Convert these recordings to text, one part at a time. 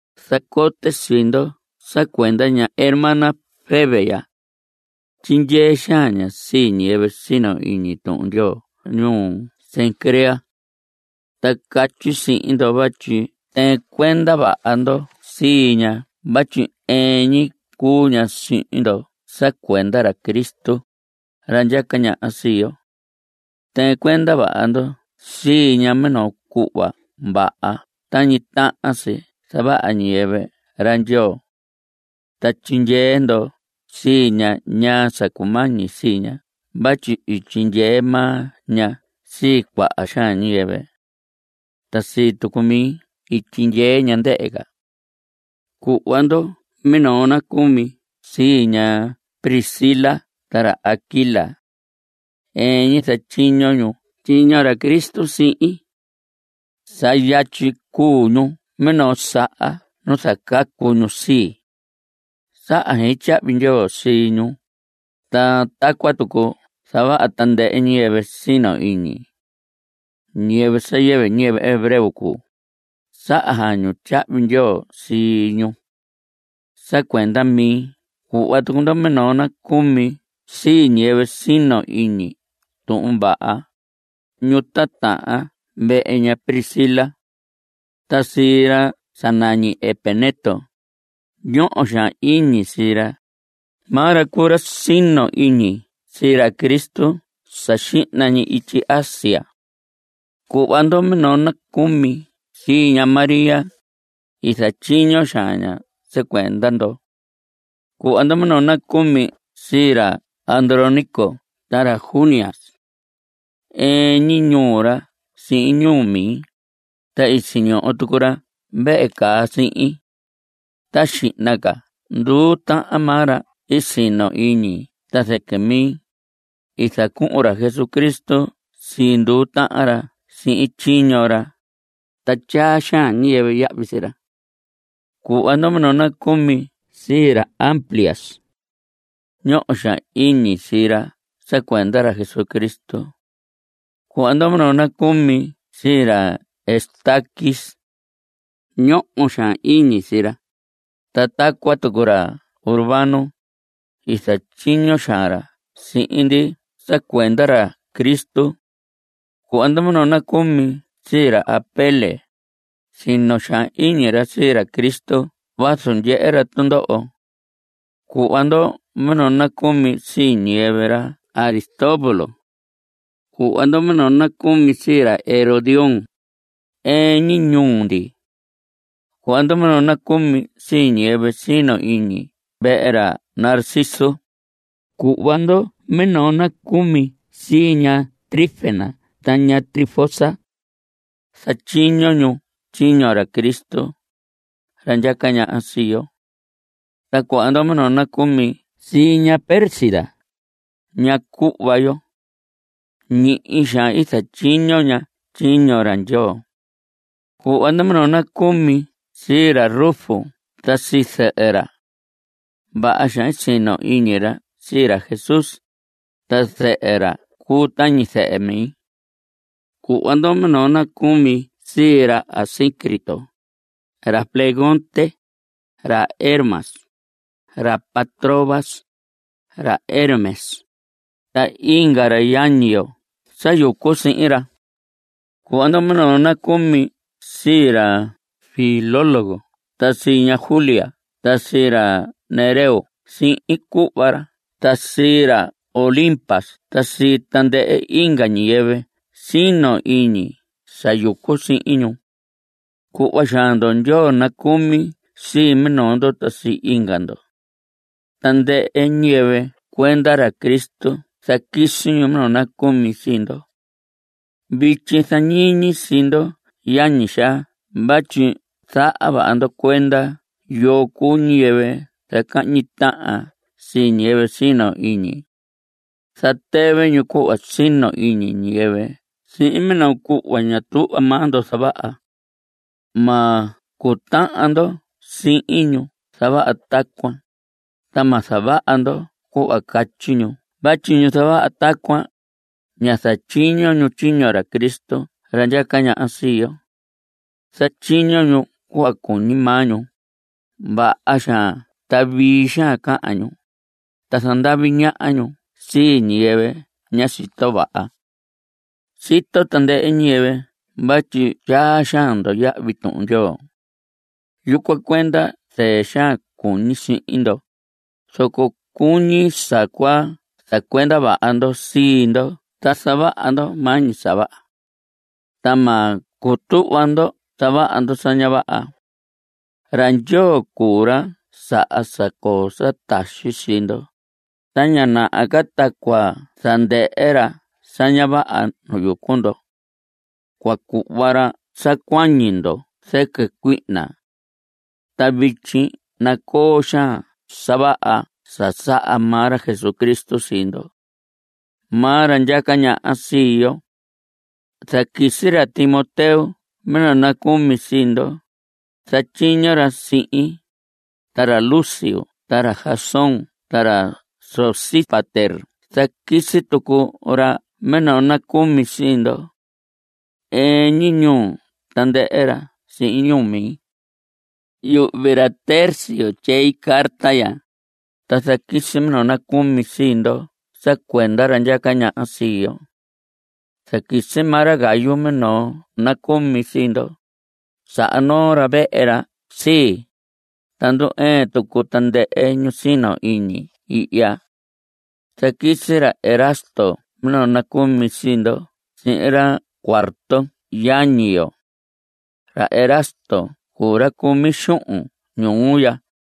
Zacote sii ndo sa cuenda ña hermana Febe ya. Tyindyee xaan ña sii ñiyɨvɨ sino iñi Tuhun Ndyoo ñuu Cencrea. Ta catyi sihin ndo vatyi tɨɨn cuenda vaha ndo sii ña vatyi ɨɨn ñi cuu ña sihin ndo sa cuenda ra Cristo, ra ndyaca ñaha sii yo. Tɨɨn cuenda vaha ndo sii ña minoo cuhva vaha tañi tahan si zavaha ñiyɨvɨ ra Ndyoo. Ta tyindyee ndo sii ña ñaa sa cumañi sii ña vatyi i tyindyee maa ña sii cuaha xaan ñiyɨvɨ. Ta sii tucu mi i tyindyee ña, ndɨhɨ ca. Cuhva ndo minoo nacumi sii ña Priscila ta ra Aquila. Ɨɨn ñi zatyiño ñu tyiño ra Cristo sihin. Sa yatyi cuu ñu minoo saha nu i zacacu ñu sii. Saha xein tyahvi ndyoo sii ñu, ta tacuan tucu zavaha tandɨhɨ ñiyɨvɨ sino iñi. Ñiyɨvɨ sa yɨvɨ ñiyɨvɨ hebreo cuu, saha xaan ñu tyahvi ndyoo sii ñu. Sa cuenda mi cuhva tucu ndo minoo nacumi sii ñiyɨvɨ sino iñi tuhun vaha, ñu titahan vehe ña Priscila. Ta sii ra sa nañi Epeneto. Ñoho xaan iñi sii ra. Maa ra cuu ra sino iñi sii ra Cristo sa xihna ñi ityi Asia. Cuhva ndo minoo nacumi sii ña María. I zatyiño xaan ña sa cuenda ndo. Cuhva ndo minoo nacumi sii ra Andrónico ta ra Junias. Ɨɨn ñi ñuu ra sihin ñuu mi. Ta i siñoho tucu ra vehe caa sihin. Ta xihna ca nduu tahan maa ra i sino iñi ta zɨquɨ mi. I zacuhun ra Jesucristo sii nduu tahan ra sihin tyiño ra. Ta tyaa xaan ñiyɨvɨ yahvi sii ra. Cuhva ndo minoo nacumi sii ra Amplias. Ñoho xaan iñi sii ra sa cuenda ra Cristo. Cuhva ndo minoo nacumi sii ra Estaquis. Ñoho xaan iñi sii ra. Ta tacuan tucu ra Urbano. I zatyiño xaan ra sihin ndi sa cuenda ra Cristo. Cuhva ndo minoo nacumi sii ra Apeles. Sino xaan iñi ra sii ra Cristo vazu ndyehe ra tundoho. Cuhva ndo minoo nacumi sii ñiyɨvɨ ra Aristóbulo. Cuhva ndo minoo nacumi sii ra Herodión. Ɨɨn ñi ñuu ndi. Cuhva ndo minoo nacumi sii ñiyɨvɨ sino iñi vehe ra Narciso. Cuhva ndo minoo nacumi sii ña Trifena ta ña Trifosa. Zatyiño ñu tyiño ra Cristo, ra ndyaca ñaha sii yo. Ta cuhva ndo minoo nacumi sii ña Pérsida, ña cuhva yo. Ñihi xaan i zatyiño ña tyiño ra Ndyoo. Cuhva ndo minoo nacumi sii ra Rufo ta sii zɨhɨ ra. Vaha xaan sino iñi ra sii ra Jesús. Ta zɨhɨ ra cuu tañi zɨhɨ mi. Cuhva ndo minoo nacumi sii ra Asíncrito, ra Flegonte, ra Hermas, ra Patrobas, ra Hermes, ta inga ra yañi yo sa yucu sihin ra. Cuhva ndo minoo nacumi sii ra Filólogo ta sii ña Julia ta sii ra Nereo sihin cuhva ra ta sii ra Olimpas ta sii tandɨhɨ inga ñiyɨvɨ sino iñi sa yucu sihin ñu. Cuhva xaan ndo ndyoo nacucumi sii minoo ndo ta sii inga ndo. Tandɨhɨ ñiyɨvɨ cuenda ra Cristo zaquisi ñu minoo nacumi sii ndo. Vityi zañiñi sii ndo yañi xaa vatyi zaha vaha ndo cuenda yoo cuu ñiyɨvɨ zacahñi tahan sii ñiyɨvɨ sino iñi. Zatɨvɨ ñu cuhva sino iñi ñiyɨvɨ sihin minoo cuhva ña tuhva maa ndo zavaha. Ma cutahan ndo sihin ñu zavaha tacuan, ta ma zavaha ndo cuhva catyi ñu vatyi ñu zavaha tacuan, ña zatyiño ñu tyiño ra Cristo ra ndyaca ñaha sii yo. Zatyiño ñu cuhva cuñi maa ñu. Vaha xaan ta vii xaan cahan ñu, ta zandavi ñaha ñu sii ñiyɨvɨ ña sito vaha. Sito tandɨhɨ ñiyɨvɨ vatyi tyaa xaan ndo yahvi Tuhun Ndyoo. Yucuan cuenda zɨɨ xaan cuñi sihin ndo, zoco cuñi sa cua zacuenda vaha ndo sii ndo ta zavaha ndo maa ñi sa vaha. Ta ma cutuhva ndo zavaha ndo sa ña vaha. Ra Ndyoo cuu ra saha sa coo sa taxi sii ndo, ta ña naha ca ta cua zandɨhɨ ra sa ña vaha nu yucu ndo. Cua cuhva ra sa cuañi ndo zɨquɨ cuihna. Ta vityi nacoo xaan sa vaha sa saha maa ra Jesucristo sii ndo. Maa ra ndyaca ñaha sii yo. Zaquisi ra Timoteo minoo nacumi sii ndo. Zatyiño ra sihin. Ta ra Lucio ta ra Jasón ta ra Sosípater zaquisi tucu ra minoo nacumi sii ndo. Ɨɨn ñi ñuu tandɨhɨ ra sihin ñuu mi. Yuhvi ra Tercio tyei carta ya, ta zaquisi minoo nacumi sii ndo sa cuenda ra ndyaca ñaha sii yo. Zaquisi maa ra Gayo minoo nacumi sii ndo. Saha noo ra vehe ra sii, ta ndu‑ɨɨn tucu tandɨhɨ ñu sino iñi ihya. Zaquisi ra Erasto minoo nacumi sii ndo sihin ra Cuarto yañi yo. Ra Erasto cuu ra cumi xuhun ñuu ya.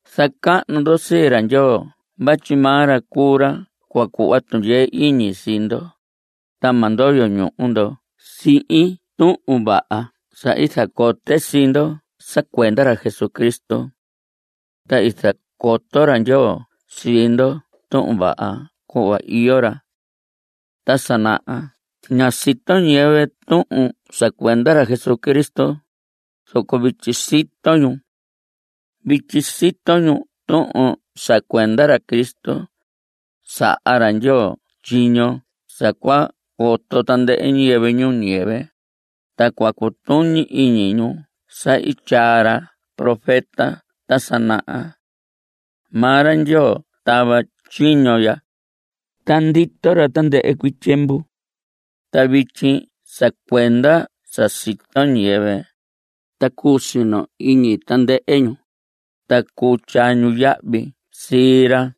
Zacahnu ndo sii ra Ndyoo vatyi maa ra cuu ra cua cuhva tundyee iñi sii ndo, ta ma ndoyo ñuhu ndo sihin tuhun vaha sa i zacote sii ndo sa cuenda ra Jesucristo. Ta i zacoto ra Ndyoo sii ndo tuhun vaha cuhva iyo ra. Ta sa naha ñá sito ñiyɨvɨ tuhun sa cuenda ra Cristo, zoco vityi sito ñu. Vityi sito ñu tuhun sa cuenda ra Cristo. Saha ra Ndyoo tyiño sa cua coto tandɨhɨ ñiyɨvɨ ñuu ñiyɨvɨ, ta cua cutuñi iñi ñu sa i tyaa ra profeta ta sa naha. Maa ra Ndyoo tava tyiño ya, ta ndito ra tandɨhɨ cuii tyiemvu. Ta vityi sa cuenda sa sito ñiyɨvɨ, ta cuu sino iñi tandɨhɨ ñu, ta cuu tyaa ñu yahvi sii ra.